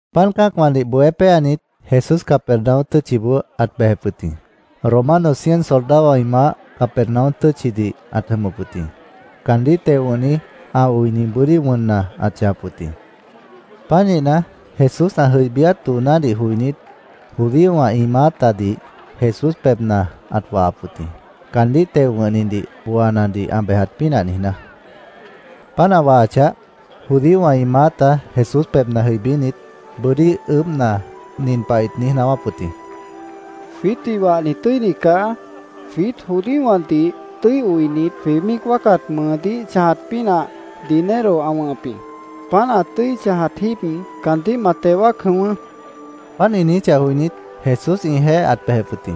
Páant cã́acwãdih bohé péanit, Jesús Capernaum tʉ́tchiboó ãt bejep wʉt jĩ. Romano cien soldadowã ĩ maáh Capernaum tʉ́tchidih ãt jʉmʉp wʉt jĩ. Caandíh teo wʉ̃hni ã oini bʉ́dí wʉnna ãt chãjap wʉt jĩ. Pánihna, Jesús ã jʉibíát doonádih joinít, judíowã ĩ maátadih Jesús pebhna ãt wahap wʉt jĩ, caandíh teo wʉ̃hnidih booanadih ã bejat pínah niijná. Páant ã wahachah, judíowã ĩ maáta Jesús pebhna jʉibínit, bʉ́dí ʉʉ́bhna, nin pah ĩt niíj naáwáp wʉt jĩ: —Jwiítdih wahni tʉ́ini caá. Jwiít judíowãdih tʉ́i oinit, jwĩ míic wáacat mʉʉdíh chãjat pínah dinero ã wʉ̃hʉp jĩ. Páant ã tʉ́i chãjat jíib, caandíh ma teo wáac jʉ̃ʉ́wʉ́, ĩt niijíp wʉt jĩ. Páant ĩ niijíchah joinít, Jesús ĩjeéh ãt bejep wʉt jĩ.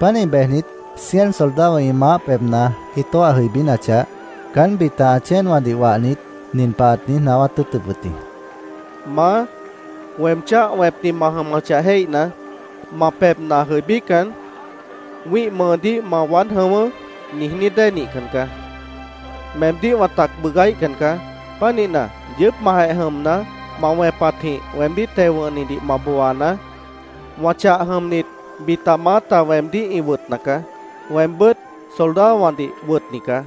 Pánih bejnit, cien soldadowã ĩ maáh pebhna ĩ tóah jʉibínachah, caán bita ã chéenwãdih wahnit, nin pah ãt niíj naáwát tʉ́ʉtʉp wʉt jĩ: “Maá, weem cháh wẽpni ma jʉmʉchah jéihna, ma pebhna jʉibícan, ‘Wĩ́ih mʉʉdíh ma waád jʉ̃ʉ́wʉ́’, niijní dée nihcan caá. Meemdíh wã tac bʉʉgáíhcan caá. Pánihna, yʉʉ́pmahjeh jʉmna, ma wẽpatjĩh weemdíh teo wʉ̃hnidih ma booanaá. Wã chah jʉmnit bita maáta weemdíh ĩ wʉtna caá. Weembʉ́t soldadowãdih wʉtni caá.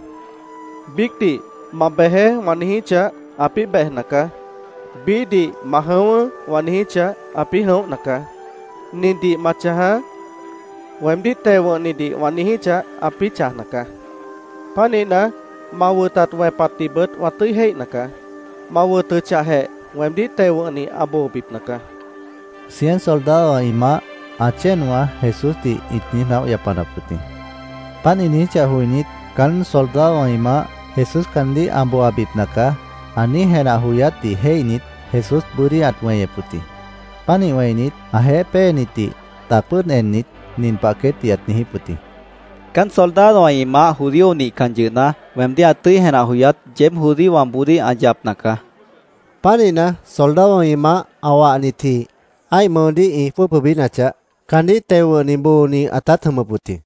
Biícdih ‘Ma bejeé’, wã niijíchah, ãpĩ́ bejna caá. Biíhdih ‘Ma jʉ̃ʉ́wʉ́’, wã niijíchah, ãpĩ́ jʉ̃óhna caá. ‘Nindih ma chãjaá’, weemdíh teo wʉ̃hnidih wã niijíchah, ãpĩ́ chãjna caá. Pánihna, ma wʉtat wẽpatdihbʉt wã tʉ́i jéihna caá. Ma wʉtʉchahjeh, weemdíh teo wʉ̃hni ã boobipna caá”, cien soldadowã ĩ maáh ã chéenwã Jesúsdih ĩt niíj naóh yapanap wʉt jĩ. Páant ĩ niijíchah joinít, caán soldadowã ĩ maáh “Jesús caandíh ã booabipna caá”, ã niíj jenah joyátdih jéihnit, Jesús bʉ́dí ãt weñep wʉt jĩ. Pánih wẽinit, ãjeéh péenitdih tac pʉ́ʉd ennit, nin pah queétdih ãt niijíp wʉt jĩ: —Caán soldadowã ĩ maáh judío nihcan yʉhna, weemdíh ã tʉ́i jenah joyát yeéb judíowãboodíh ã yapna caá, ãt niijíp wʉt jĩ. Pánihna, soldadowã ĩ maáh ã wahnitji ã́ih mʉʉdíh ĩ jwʉ́ʉb jʉibínachah, caandíh teo wʉ̃hni booni ãtát jʉmʉp wʉt jĩ.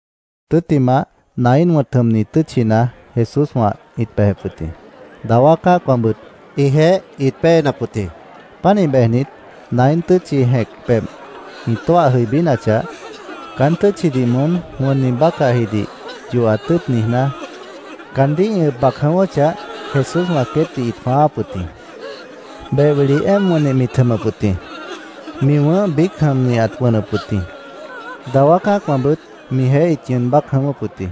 Tʉ́ttimah, Naín wʉ̃t jʉmni tʉ́tchina Jesúswã ĩt bejep wʉt jĩ. Dawá cã́acwãbʉt ĩjeéh ĩt péenap wʉt jĩ. Pánih bejnit, Naín tʉ́tchi jẽc pebh ĩ tóah jʉibínachah, caán tʉ́tchidih moón wʉnni bácahjidih yohat tʉ́ʉt niijná, caandíh ĩ ʉb bac jʉ̃ʉ́wʉ́chah, Jesúswã queétdih ĩt jwãááp wʉt jĩ. Beh wili éemp wʉnnih mit jʉmʉp wʉt jĩ. Mi wʉ̃ʉ́h biíc jʉmni ãt wʉnʉp wʉt jĩ. Dawá cã́acwãbʉt mijeéh ĩt ñʉʉn bác jʉ̃ʉ́wʉ́p wʉt jĩ.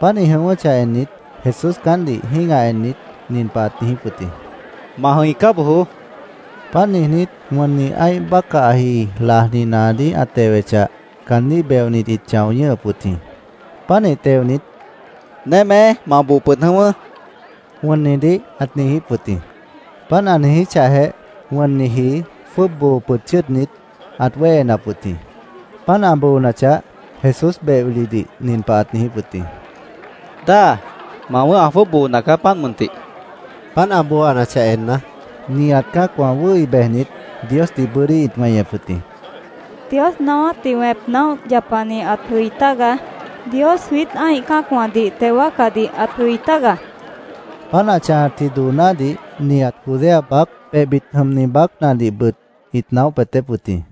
Páant ĩ jʉ̃ʉ́wʉ́chah ennit, Jesús caántdih jĩ́gah ennit, nin pah ãt niijíp wʉt jĩ: —Ma jʉ̃icá bojoó, ãt niijíp wʉt jĩ. Páant niijnít, wʉnni ã́ih bácahji lajni naadíh ã tewechah, caandíh beonit ĩt chão ñʉ́hʉp wʉt jĩ. Pánih teonit, “¡Némé, ma boo pʉd jʉ̃ʉ́wʉ́!” wʉnnidih ãt niijíp wʉt jĩ. Páant ã niijíchahjeh, wʉnniji jwʉ́ʉb boo pʉd chʉ́ʉdnit, ãt wéhenap wʉt jĩ. Páant ã boonachah, Jesús beh wilidih nin pah ãt niijíp wʉt jĩ: —Dáa, ma wʉ̃ʉ́h ã jwʉ́ʉb boona caá, páant mʉntih, ãt niijíp wʉt jĩ. Páant ã booanachah enna, nihat cã́acwã wʉ́hi bejnit, Diosdih bʉ́dí ĩt weñep wʉt jĩ. —Dios naáwátdih wẽp naóh yapani ãt jʉi tágaá. Dios jwiít ã́ih cã́acwãdih teo wáacadih ãt jʉi tágaá, ĩt míic niijíp wʉt jĩ. Páant ã chãjatji doonádih nihat Judea baác, pebhbit jʉmni baácnadihbʉt ĩt naóh peetép wʉt jĩ.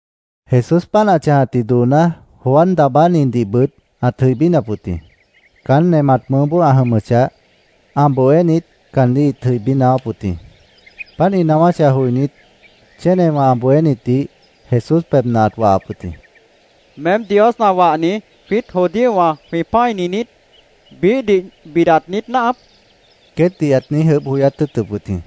Jesús páant ã chãjatji dooná Juan Daabánidihbʉt ãt jʉibínap wʉt jĩ. Caán nemat mʉʉ́boó ã jʉmʉchah, ã bohénit caandíh ĩt jʉibí naáwáp wʉt jĩ. Páant ĩ naáwáchah joinít, chénewã ã bohénitdih Jesús pebhna ãt wahap wʉt jĩ. “¿Meém Dios ã wahni, jwiít judíowã jwĩ pã́ini niít? ¿Biíhdih bidat niít náahap?” queétdih ãt niíj ʉʉ́bh joyát tʉ́ʉtʉp wʉt jĩ.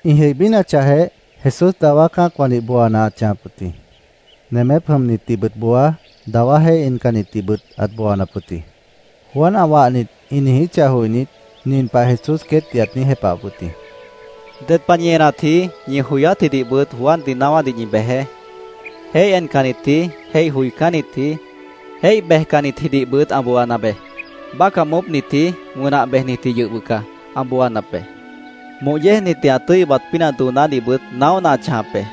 Ĩ jʉibínachahjeh, Jesús dawá cã́acwãdih booana ãt chãjap wʉt jĩ. Nemép jʉmnitdihbʉt booa, dawá jéih encannitdihbʉt ãt booanap wʉt jĩ. Juan ã wahnit ĩ niijíchah joinít, nin pah Jesús queétdih ãt niíj jepahap wʉt jĩ: —Ded pah ñi enatji, ñi joyátjidihbʉt Juandih naáwádih ñi bejeé. ‘Jéih encannitji, jéih joicánnitji, jéih bejcannitjidihbʉt ã booana beé. Bácah moópnitji, wʉnah bejnitjidih yʉh bʉca ã booanap be.Moh yéejnitdih ã tʉ́i ʉbat pínah doonádihbʉt naóhna ã chãjap be.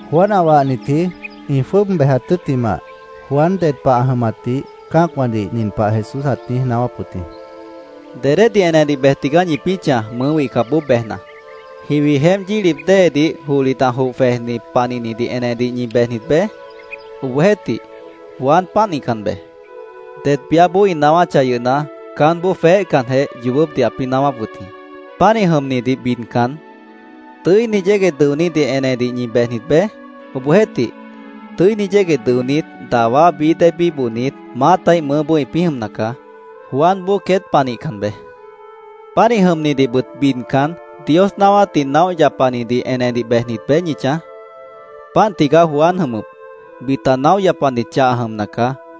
Juan ã wahnitji ĩ jwʉ́ʉb bejat tʉ́ttimah, Juan ded pah ã jʉmatdih cã́acwãdih nin pah Jesús ãt niíj naáwáp wʉt jĩ: “¿Dedédih enedih bej tigaá ñipĩ́ chãj, mʉʉ́ wihcapboó bejna? ¿Jiwi jeémp yílip déedih johlit ã joh jwejni panihnidih enedih ñi bejnit beé? Obohjeéhtih, Juan pánihcan beé. Det biáboó ĩ naáwáchah yʉhna, caánboó jweéhcanjeh yoobópdih ãpĩ́ naáwáp wʉt jĩ. Pánih jʉmnidih bidcan, ¿tʉ́ini yégueh dʉonídih enedih ñi bejnit beé? Obohjeéhtih, tʉ́ini yégueh dʉonít, dawá bií dée bíbohnit, maátaíh mʉʉ́boó ĩpĩ́ jʉmna caá. Juanboó queét pah nihcan beé. Pánih jʉmnidihbʉt bidcan, ¿Dios naáwátdih naóh yapanidih enedih bejnit beé ñi chãj? Páant tigaá Juan ã jʉmʉp. Bita naóh yapanit chah ã jʉmna caá.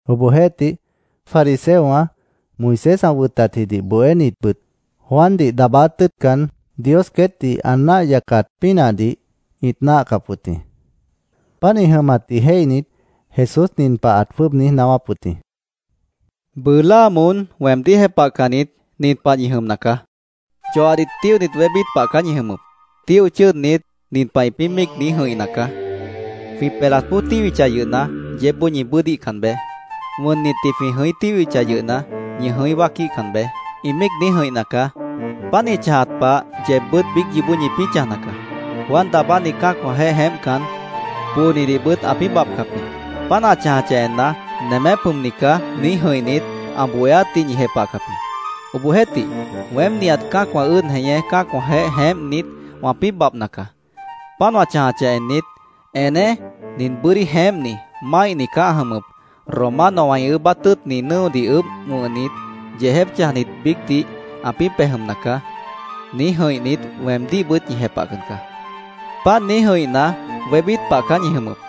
Obohjeéhtih, fariseowã, Moisés ã wʉtatjidih bohénitbʉt, Juandih daabáát tʉ́ʉtcan, Dios queétdih ã náah yacat pínahdih ĩt náahcap wʉt jĩ. Páant ĩ jʉmatdih jéihnit, Jesús nin pah ãt jwʉ́ʉb niíj naáwáp wʉt jĩ: “Bʉʉ láa moón weemdíh jepahcannit, nin pah ñi jʉmna caá: Yoahdih tíohnit wébít pah caá ñi jʉmʉp. Tíoh chʉ́ʉdnit, nin pah ĩpĩ́ míic niíj jʉ̃ihna caá: ‘Jwĩ pelat póoj tíhwichah yʉhna, yeébboó ñi bʉ́ʉdíhcan beé. Wʉnnitdih jwĩ jʉ̃í tíhwichah yʉhna, ñi jʉ̃í wáaquíhcan beé’, ĩ míic niíj jʉ̃ihna caá. Páant ĩ chãjat pah, yeebbʉ́t biíc yoobó ñipĩ́ chãjna caá. Juan Daabáni cã́acwãjeéh jeémpcan, poonidihbʉt ãpĩ́ babhcap jĩ. Páant ã chãjcah enna, ‘Nemép jʉmni caá’, niíj jʉ̃ihnit, ã bohéátdih ñi jepahcap jĩ. Obohjeéhtih, weém, nihat cã́acwã ʉ́ʉd jeñé cã́acwãjeéh jeémpnit, wãpĩ́ babhna caá. Páant wã chãjachah ennit, ‘Eneé. Nin bʉ́dí jeémpni, máihni caá ã jʉmʉp. Romanowã ĩ ʉʉ́bát tʉ́ʉtni nʉ́odih ʉʉ́bh wʉ̃hnit, yeejép chãjnit biícdih ãpĩ́ pej jʉmna caá’, niíj jʉ̃ihnit, weemdíhbʉt ñi jepahcan caá. Páant niíj jʉ̃ihna, wébít pah caá ñi jʉmʉp.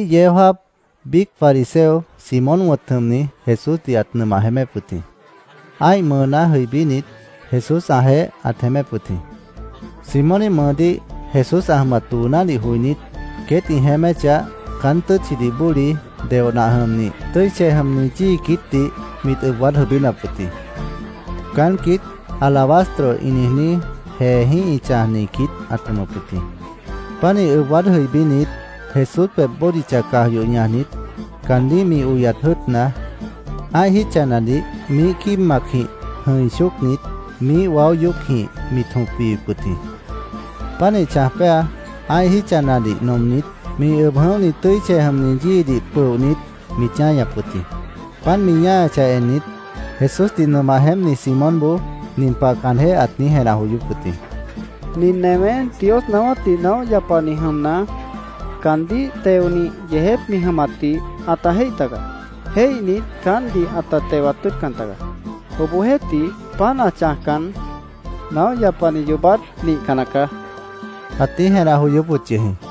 Biíh yeó jáap biíc fariseo, Simón wʉ̃t jʉmni, Jesúsdih ãt nʉmah jeémép wʉt jĩ. Ã́ih mʉʉná jʉibínit, Jesús ãjeéh ãt jeémép wʉt jĩ. Simóníh mʉʉdíh Jesús ã jʉmat doonádih joinít, queét ĩ jeéméchah, caán tʉ́tchidih bóli, deoh nah jʉmnih, tʉ́i chej jʉmni yíi quiítdih mit ʉb waád jʉibínap wʉt jĩ. Caán quiít alabastro ĩ niijní jeejĩ́h ĩ chãjni quiít ãt jʉmʉp wʉt jĩ. Pánih ʉb waád jʉibínit, Jesús pebh bódicha caj yoh ñajnit, caandíh mi oyat jʉ́ʉtna, ã́ih jítchanadih miíh quíib macjĩh jʉ̃i chócnit, miíh waó yoócjĩh mit jõp wiwip wʉt jĩ. Pánih chãj péa, ã́ih jítchanadih nomnit, mi ʉb jʉ̃óhni tʉ́i chej jʉmni yíidih pʉohnit, mit ñáñap wʉt jĩ. Páant mi chãjachah ennit, Jesúsdih nʉmah jeémpni Simónboó nin pah caanjéh ãt niíj jenah joyóp wʉt jĩ: “Nin newé Dios naáwátdih naóh yapani jʉmna, caandíh teonih yeejép mi jʉmatdih ãta jéih tagaá. Jéihnit, caántdih ãta tewat tʉ́ʉtcan tagaá. Obohjeéhtih, páant ã chãjcan, naóh yapani yoobát nihcan nacaá”, ãt niíj jenah joyóp wʉt yʉh jĩ.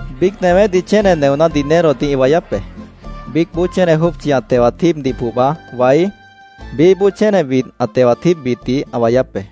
—Biíc newédih chéne neoná dinerodih ĩ wayáp be. Biícboó chéne jópchi ã tewat jíibdih pohba waí, biíhboó chéne widh ã tewat jíibbitdih ã wayáp be.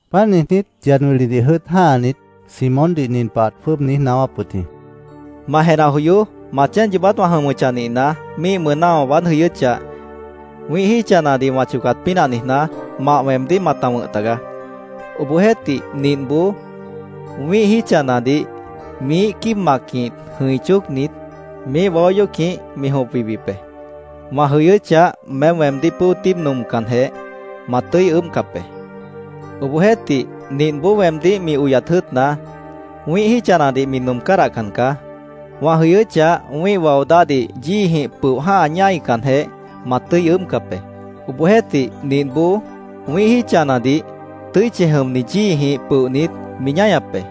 Páant niijnít, yad wilidih jʉ́ʉt jã́hanit, Simóndih nin pah ãt jwʉ́ʉb niíj naáwáp wʉt jĩ: —Ma jenah joyoó. Ma chéen yoobát wã jʉmʉchah nihna, míih mʉʉná wã waád jʉyʉ́chah, wĩ́ih jítchanadih wã chocat pínah niijná, mah weemdíh mata wʉ̃h tagaá. Obohjeéhtih, nintboó wĩ́ih jítchanadih miíh quíib macjĩh jʉ̃i chócnit, miíh waó yoócjĩh mi jõp wiwip be. Wã jʉyʉ́chah, meém weemdíh pʉ́o tíibdih nomcanjeh, ma tʉ́i ʉʉ́bhcap be. Obohjeéhtih, nintboó weemdíh mi oyat jʉ́ʉtna, wĩ́ih jítchanadih mi nom cádahcan caá. Wã jʉyʉ́chah, wĩ́ih wao dáhdih yíijĩh pʉoh jã́ha ñáicanjeh, ma tʉ́i ʉʉ́bhcap be. Obohjeéhtih, nintboó wĩ́ih jítchanadih tʉ́i chej jʉmni yíijĩh pʉohnit, mi ñáñap be.